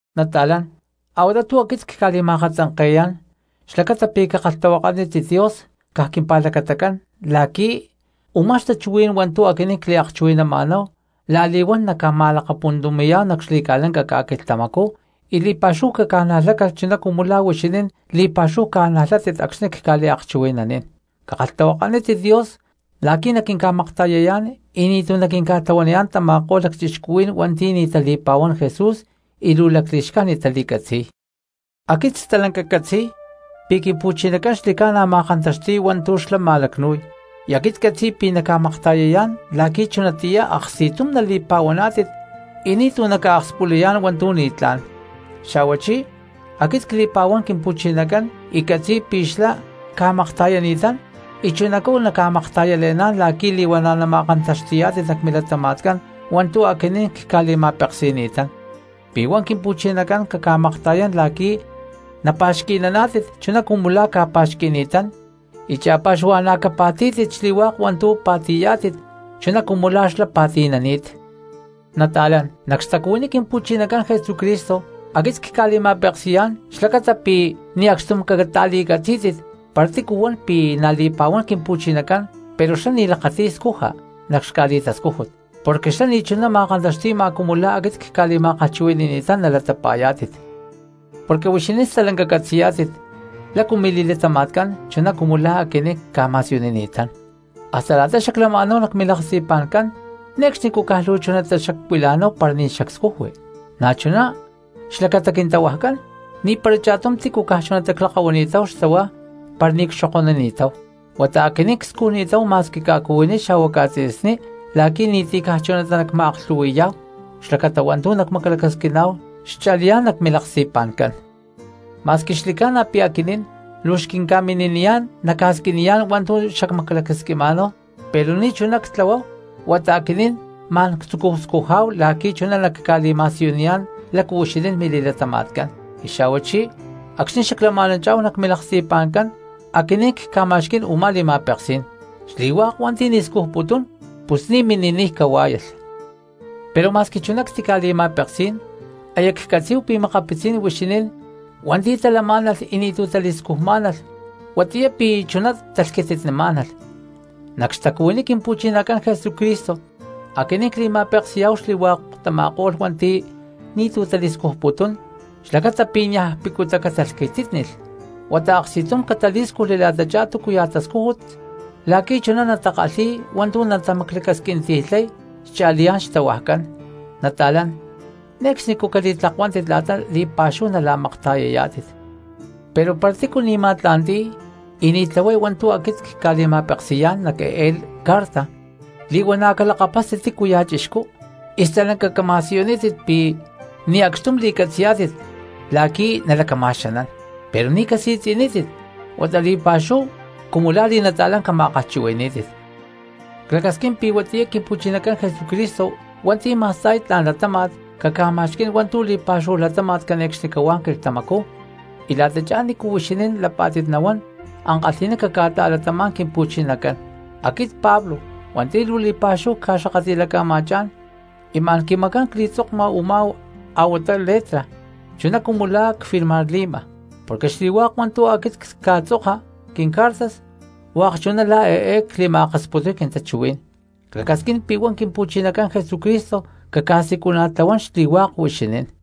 Nata̠lán, a̠huatá tu̠ aquit cca̠li̠ma̠katzanke̠yá̠n xlacata pi̠ cakalhtahuakanítit Dios caj quimpa̠lacatacán la̠qui̠ u̠má xtachuhuí̠n hua̠ntu̠ aquinín cliakchuhui̠nama̠náhu la̠li̠huán nacma̠lakapuntumi̠yá̠hu nac xli̠ca̠lanca ca̠quilhtamacú y li̠pa̠xúhu caca̠najlácalh chuná cumu la̠ huixinín li̠pa̠xúhu ca̠najlátit acxni̠ cca̠liakchuhui̠nanín. Cakalhtahuakanítit Dios la̠qui̠ naquinca̠makta̠yayá̠n y ni̠tu̠ naquinca̠tlahuaniyá̠n tama̠ko̠lh lacchixcuhuí̠n hua̠nti̠ ni̠ tali̠pa̠huán Jesús y luu li̠xcájnit tali̠catzi̠y. Aquit stalanca ccatzi̠y pi̠ Quimpu̠chinacán xli̠ca̠na ma̠kantaxti̠y hua̠ntu̠ xlá ma̠lacnu̠y y aquit ccatzi̠y pi̠ na̠ naca̠makta̠yayá̠n la̠qui̠ chunatiyá aksti̠tum nali̠pa̠huaná̠tit y ni̠tu̠ naca̠akspulayá̠n hua̠ntu̠ ni̠tlá̠n. Xa̠huachí aquit cli̠pa̠huán Quimpu̠chinacán y ccatzi̠y pi̠ xlá ca̠makta̠yani̠tán y chunacú naca̠makta̠yale̠ná̠n la̠qui̠ li̠huana̠ nama̠kantaxti̠yá̠tit nac milatama̠tcán hua̠ntu̠ aquinín cca̠li̠ma̠peksi̠ni̠tán. Pi̠ huá Quimpu̠chinacán caca̠makta̠yán la̠qui̠ napa̠xqui̠naná̠tit chuná cumu la̠ ca̠pa̠xqui̠ni̠tán y cha̠pa̠xuhua̠na̠ capa̠tí̠tit xli̠hua̠k hua̠ntu̠ pa̠ti̠yá̠tit chuná cumu la̠ xlá pa̠ti̠nani̠t. Nata̠lán, nac xtacuhuiní Quimpu̠chinacán Jesucristo aquit cca̠li̠ma̠peksi̠yá̠n xlacata pi̠ ni̠ acxtum cata̠li̠catzí̠tit para ti̠cu huan pi̠ na̠ li̠pa̠huán Quimpu̠chinacán pero xlá ni̠ lakati̠y scuja nac xca̠li̠tascújut, porque xlá ni̠chuná ma̠kantaxti̠ma cumu la̠ aquit cca̠li̠ma̠kalhchuhui̠ni̠tán nalatapa̠yá̠tit. Porque huixinín stalanca catzi̠yá̠tit lácu mili̠latama̠tcán chuná cumu la̠ aquinín cca̠ma̠siyunini̠tán; hasta la̠ta xaclama̠náhu nac milaksti̠pa̠ncán ne̠cxnicú caj luu chunatá xacuila̠náhu para ni̠ xacscujui. Na̠chuná xlacata quintahuajcán, ni̠para cha̠tum tícu caj chunatá clakahuani̠táhu xtahuá para ni̠ cxokonini̠táhu, huata aquinín cscujni̠táhu ma̠squi ca̠cuhuiní xa̠hua ca̠tzi̠sní la̠qui̠ ni̠ti̠ caj chunatá nacma̠aklhu̠hui̠yá̠hu xlacata hua̠ntu̠ xacmaclacasquima̠náhu xcha̠liyá̠n nac milaksti̠pa̠ncán. Ma̠squi xli̠ca̠na pi̠ aquinín luu xquinca̠mini̠niyá̠n nacca̠squiniyá̠n hua̠ntu̠ xacmaclacasquiná̠hu pero ni̠chuná ctlahuáhu, huata aquinín ma̠n ctzucúhu scujá̠hu la̠qui̠ chuná nacca̠li̠ma̠siyuniyá̠n lácu huixinín mili̠latama̠tcán. Y xa̠huachí acxni̠ xaclama̠nanchá̠hu nac milaksti̠pa̠ncán aquinín cca̠ma̠xquí̠n u̠má li̠ma̠peksí̠n: “Xli̠hua̠k hua̠nti̠ ni̠ scujputún pus ni̠ mini̠niy cahuá̠yalh.” Pero ma̠squi chuná ctica̠li̠ma̠peksí̠n aya ccatzí̠hu pi̠ makapitzí̠n huixinín hua̠nti̠ talamá̠nalh y ni̠tu̠ tali̠scujmá̠nalh huatiyá pi̠ chuná talhquititnimá̠nalh. Nac xtacuhuiní Quimpu̠chinacán Jesucristo aquinín cli̠ma̠peksi̠yá̠hu xli̠hua̠k tama̠ko̠lh hua̠nti̠ ni̠tu̠ tali̠scujputún xlacata pi̠ niaj picutá catalhquitítnilh huata aksti̠tum catalí̠scujli la̠tachá túcuya̠ tascújut la̠qui̠ chuná natakalhi̠y hua̠ntu̠ natamaclacasquinti̠lhay cha̠liyá̠n xtahuajcán. Nata̠lán, ne̠cxnicú cali̠tlakuántit la̠ta li̠pa̠xúhu la̠makta̠yayá̠tit. Pero para tícu ni̠ ma̠tla̠nti̠y y ni̠ tlahuay hua̠ntu̠ aquinín cca̠li̠ma̠peksi̠yá̠n nac eé carta li̠huana̠ calakapástit tícuya̠ cristiano y stalanca cama̠siyunítit pi̠ ni̠ acxtum li̠catzi̠yá̠tit la̠qui̠ nalacama̠xanán. Pero ni̠ casi̠tzi̠nítit huata li̠pa̠xúhu cumu la̠ li̠nata̠lán cama̠kalhchuhui̠ní̠tit. Clacasquín pi̠ huatiyá Quimpu̠chinacán Jesucristo hua̠nti̠ ma̠sta̠y tla̠n latáma̠t caca̠ma̠xquí̠n hua̠ntu̠ li̠pa̠xúhu latáma̠t cane̠cxnicahuá quilhtamacú y la̠tachá nícu huixinín lapá̠tit nahuán ankalhi̠ná caca̠ta̠latamá̠n Quimpu̠chinacán. Aquit Pablo hua̠nti̠ luu li̠pa̠xúhu cca̠xakatli̠laca̠ma̠chá̠n, y ma̠n quimacán cli̠tzokma u̠má a̠huatá letra, chuná cumu la̠ cfirmarli̠ma, porque xli̠hua̠k hua̠ntu̠ aquit cca̠tzoka quincartas hua̠k chuná la̠ eé cli̠ma̠akasputuy quintachuhuí̠n. Clacasquín pi̠ huá Quimpu̠chinacán Jesucristo caca̠siculana̠tlahuán xli̠hua̠k huixinín.